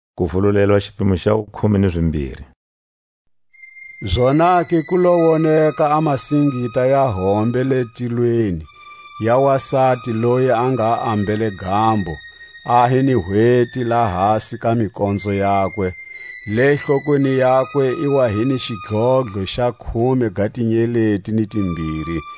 A wasati ni drako. Zonake ku lo woneka a masingita ya hombe le tilweni, ya wasati loyi a nga ambele gambo, a hi ni hweti lahasi ka mikonzo yakwe, le hlokweni yakwe i wa hi ni xidlodlo xa khume ga tinyeleti ni timbiri.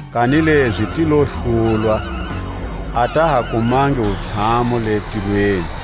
kanilezi ti lo hluliwa, a ta ha kumangi wutshamu le tilweni.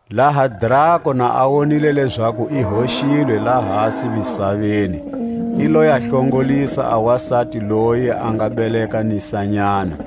Laha drako na a wonile lezaku i hoxilwe lahasi misaveni, i lo ya hlongolisa a wasati loyi a nga beleka nisanyana.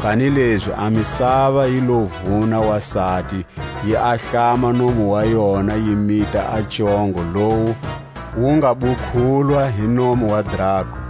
Kanilezi a misava yi lo vuna wasati, yi ahlama nomu wa yona, yi mita a congo lowu wu nga bukhulwa hi nomu wa drako.